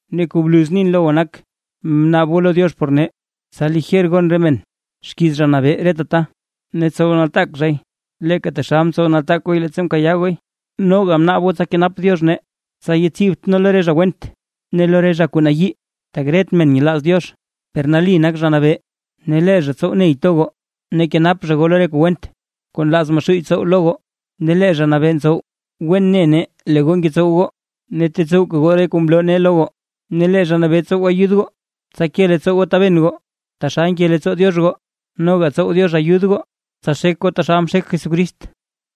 Ne kuu bluz nin lo goo nak: Bnaab goo lo Diox por nee, tsa lijer gon re men xkiiz Zha Nabee reta ta, ne tsow nataak zhay leeka taxal mtsow nataak gooy leettsa mkayaa gooy. Noga bnaab goo tsa kenap Diox nee tsa yatsibt nee lo re zha went, ne lo re zha kuu nayii, tak ret men nyelaaz Diox. Per nali nak Zha Nabee ne lee zha tsow ney to goo ne kenap zha goo lo re kuu went kuu nlaaz Maxuuy tsow lo goo. Ne lee Zha Nabee ntsow, wen ne nee lee goo ngetsow goo ne tetsowka goo re kuu mloo nee lo goo. Ne lee Zha Nabee tsow ayud goo, tsa ke leettsoo goo taben goo taxal nke leettsoo Diox goo, noga tsow Diox ayud goo, tsa xek goo taxal mxek Jesucrist.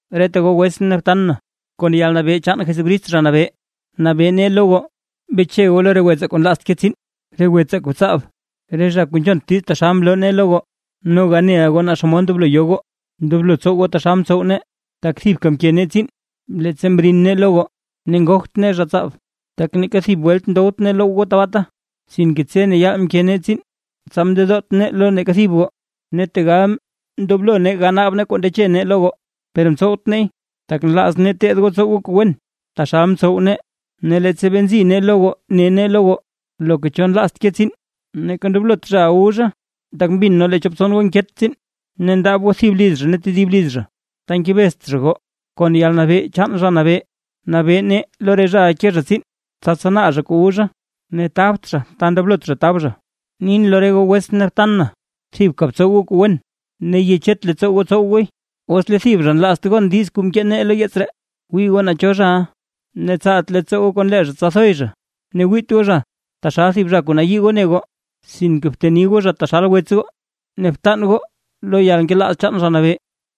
Reta goo wetsʼn ne btan na, kon yalnabee chaan Jesucrist Zha Nabee, nabee nee lo goo, beche goo lo re wetsaa kuu nlaazt ke tsiin, re wetsaa kuu tsaab, re zha kuu nzhont diiz taxal mloo nee lo goo. Noga neʼa goo naa xomod ndoblo yo goo, ndoblo tsow goo taxal mtsow nee, tak thibka mke nee tsiin leettsa mrin nee lo goo ne ngogt nee zha tsaab. Tak neeka thib welt ndowt nee loww goo tabaata. Sinke tse ne yaal mke nee tsiin tsa mndedoot nee lo neeka thib goo. Ne tegal ndoblo nee ganaab nee kuu mndeche nee lo goo, per mtsowt neey, tak nlaaz nee teed goo tsow goo goo kuu wen taxal mtsow nee. Ne leettsa bee nzi nee lo goo ne nee lo goo: Loka cho nlaazt ke tsiin neeka ndoblot zhaʼa wu zha. Tak mbin nee lee chop tson goo nket tsiin ne ndaab goo thib liz zha ne tedib liz zha ta ngebezt zha goo. Kon yalnabee chaan Zha Nabee, nabee nee lo re zhaʼa ke zha tsiin, tsa tsanaa zha kuu wu zha ne tabt zha ta ndoblot zha tab zha. Nin lo re goo wetsʼn ne btan na, thibka btsow goo kuu wen, ne yechet leettsoo goo tsow gooy. Os lee thib zha nlaazt gon diiz kuu mkee nee lo yeets ree, wii goo naa cho zhaʼa ne tsaalt leettsoo goo kon lee zha tsa thoy zha. Ne wiit goo zha taxal thib zha kuu nayii goo ne goo, sinke bteni goo zha taxal wets goo ne btan goo lo yalnkelaaz chaan Zha Nabee.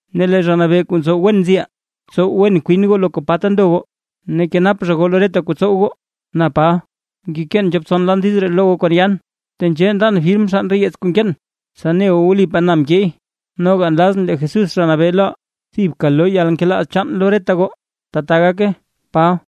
Ne lee Zha Nabee kuu ntsow wen nziʼaa, tsow wen kwin goo loka pa ta ndo goo ne kenap zha goo lo reta kuu tsow goo. Na Paba, ngekeen chop tson lan diiz ree lo goo kon yaan. Tenzhee ndan firm xann re yeets kuu nkeen, tsa ne goo wlipaa na mkeey. Noga nlazʼn lee Jesús Zha Nabee loʼaa, thibka loo yalnkelaaz chaan lo reta goo. ¡Tbaa gake! Paba